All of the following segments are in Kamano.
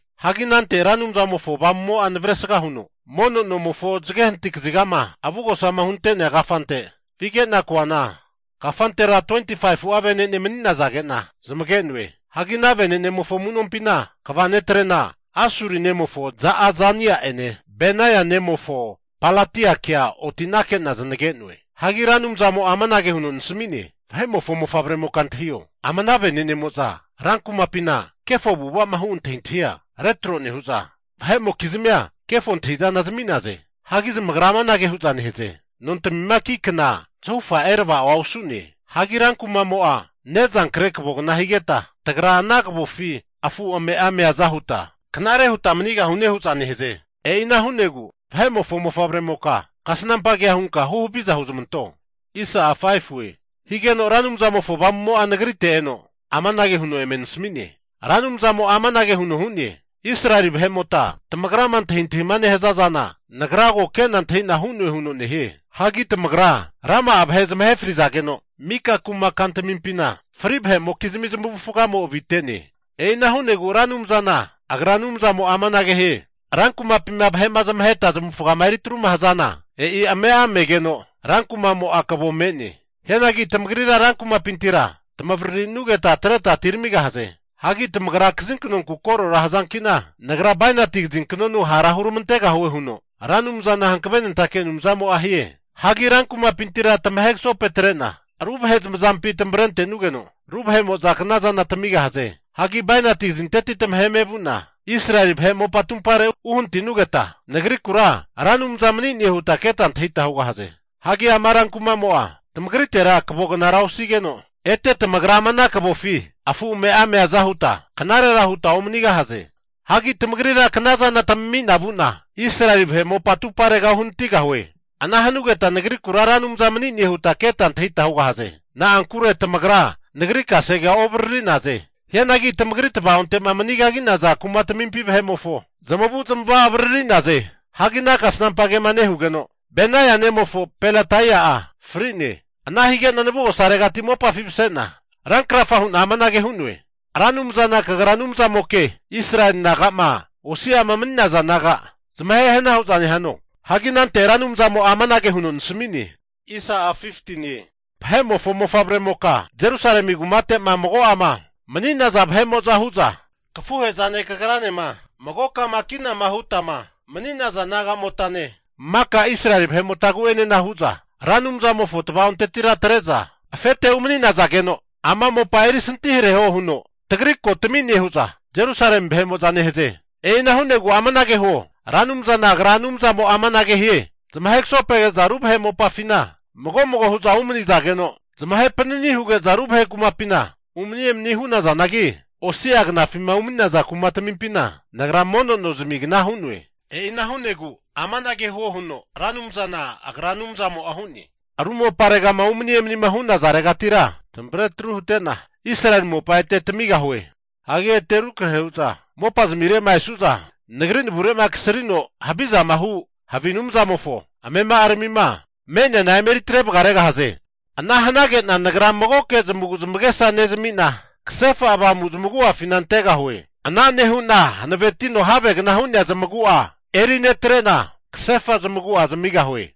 Hagi anante Ra Anumzamofo Avamumo'a navresga huno mono nomofo zage hanati kazigama avugosama hunte'nea kafante vige'na koana, kafantera 25'a vene'ne mani'nazage'na zamage'noe. Hagi ana vene'nemofo amu'nompina kva netrena Asuri nemofo Ja'azania'ene, Benaia nemofo Pelatiakea otinake'na zanage'noe. Hagi Ra Anumzamo'a amanage huno nasmi'ne, Vahe'mofo mofavremoka antahio, ama ana venenemo'za rankumapina kefo avu'ava'ma hu antahintahia retro nehu'za, vahe'mokizmia kefo antahi'zana zami'naze. Hagi zamagra amanage hu'za nehaze, nontamima ki kna zahufa erava'o osu'ne. Hagi rankuma'mo'a ne'zankre kavogna higeta, tagra ana kavofi afu ame'a meaza huta knare huta manigahune hu'za nehaze. E'ina hu'negu vahe'mofo mofavremoka kasnampa kea hunka huhaviza huzamanto. Higeno Ra Anumzamofo Avamumo'a nagrite eno amanage huno eme nasmi'ne, Ra Anumzamo'a amanage huno hu'ne, Israeli vahemota tamagrama antahintahima nehaza zana Nagra ko kena antahina hu'noe huno nehie. Hagi tamagra rama'a vahe zamahe frizageno, mika kuma kantamimpina fri vahe'mokizmi zamavufagamo avite. E'ina hu'negu Ra Anumzana Agra Anumzamo'a amanage hie, rankumapima vahe'ma zamaheta zamavufagama eritruma hazana, e'i ame'a megeno rankumamo'a kavo me'ne. Hianagi tamagrira rankumapintira tamavaririnugeta atreta atiramigahaze. Hagi tamagra kazinkanonku korora hazankina, Nagra bainati kazinknonu hara huramantegahue huno Ra Anumzana hankavenentake Anumzamo'a hie. Hagi rankumapintira tamahe kasopetre'na ru vahe zamazampi tamavrente'nugeno, ru vahe'mo'za knazana tamigahaze. Hagi bainati kazinteti tamaheme vu'na Israeli vahe mopa atupare uhanati'nugeta, Nagrikura Ra Anumza mani'ne huta keta antahita hugahaze. Hagi ama rankumamo'a tamagritera kavognara osanigeno, ete tamagra ama ana kavofi afu ame'a meaza huta knarera huta omanigahaze. Hagi tamagrira knazana tamami'na vu'na Israeli vahe mopa atupare uhanatigahue. Ana hanugeta Nagrikura Ra Anumza mani'ne huta keta antahita hugahaze. Na'ankure tamagra Nagri kasegea ovariri'naze. Hianagi tamagri tavaonte'ma mani kagi'naza kumatamimpi vahe'mofo zamavu'zamava avariri'naze. Hagi ana kasnampa kema nehugeno, Benaia nemofo Pelataia'a fri'ne. Ana hige'na navugosaregati mopafi mase'na rankrafa hu'na amanage hu'noe, Ra Anumzana kagra Anumzamoke! Israeli naga'ma osi'ama mani'naza naga zamahe hana hu'za nehano? Hagi anante Ra Anumzamo'a amanage huno nasami'ne, Vahe'mofo mofavremoka, Jerusalemi kumate'ma mago'ama mani'naza vahe'mo'za hu'za, kafuhe'zane kagranema magokama kinama hutama mani'naza nagamotane maka Israeli vahe'motagu'enena hu'za, Ra Anumzamofo tava'ontetira atre'za afete umani'nazageno, ama mopa eri santihareho huno tagri ko tami'ne hu'za Jerusalemi vahe'mo'za nehaze. E'ina hu'negu amanage huo, Ra Anumzana Agra Anumzamo'a amanage hie, Zamahe kasopoge'za ru vahe mopafina mago mago hu'za umanizageno, zamahe panani huge'za ru vahe kumapina umani emani hu'nazanagi, osi'a knafima umani'naza kumatmimpina Nagra mono nozmigna hu'noe. E'ina hu'negu amanage huo huno Ra Anumzana Agra Anumzamo'a hu'ne, ru moparegama umani emanima hu'nazaregatira tamavre atru hute'na, Israeli mopa ete tamigahue. Hagi ete rukrahe huza mopazmire'ma esu'za Nagri navure'ma kasrino havizama hu havi anumzamofo amema'aramima me'neana emeri atre vagaregahaze. Ana hanage'na Nagra magoke zamagu zamagesa nezamina, kasefa avamu zamagu'afina antegahue. Ana nehu'na hankavetino havegna hu'nea zamagu'a eri netrena, kasefa zamagu'a zamigahue.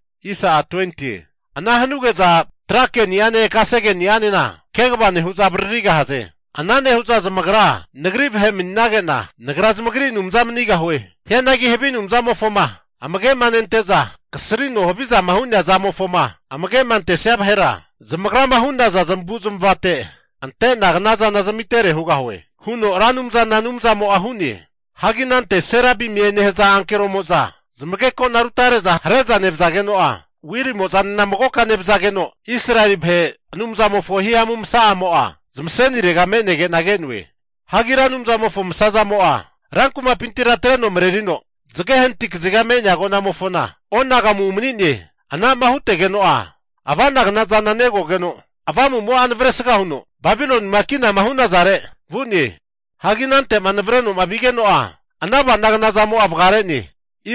Ana hanuge'za tra keni'ane kasegeni'anena kegava nehu'za avaririgahaze. Ana nehu'za zamagra Nagri vahe mani'nage'na, Nagra zamagri Anumza manigahue. Hianagi havi anumzamofoma amagema nente'za kasrino havizama hu'nea zamofoma amage'ma antesia vahera zamagrama hu'naza zamavu'zmavate ante'na knazana zamitere hugahue huno Ra Anumzana Anumzamo'a hu'ne. Hagi anante Serabimiema nehaza ankeromo'za zamagekona rutare'za hare'za nevazageno'a wilimozanena magoka nevazageno, Israeli vahe Anumzamofo hihamu masa'amo'a zamasenirega me'nege'na ke'noe. Hagi Ra Anumzamofo masazamo'a, rankumapintira atreno marerino zage hanati kaziga me'nea agonamofona onagamu umane'ne. Anama hutegeno'a ava'nagna zana negogeno Avamumo'a navresga huno Babilonima kinama hu'nazare vu'ne. Hagi anante'ma navrenoma vigeno'a ana ava'nagna zamo'a vagare'ne.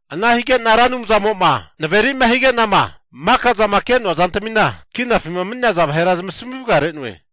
Ana higena Ra Anumzamo'ma naveri'ma higenama maka zama ke'noa zantamina kinafima mani'naza vahera zamasmi vagare'noe.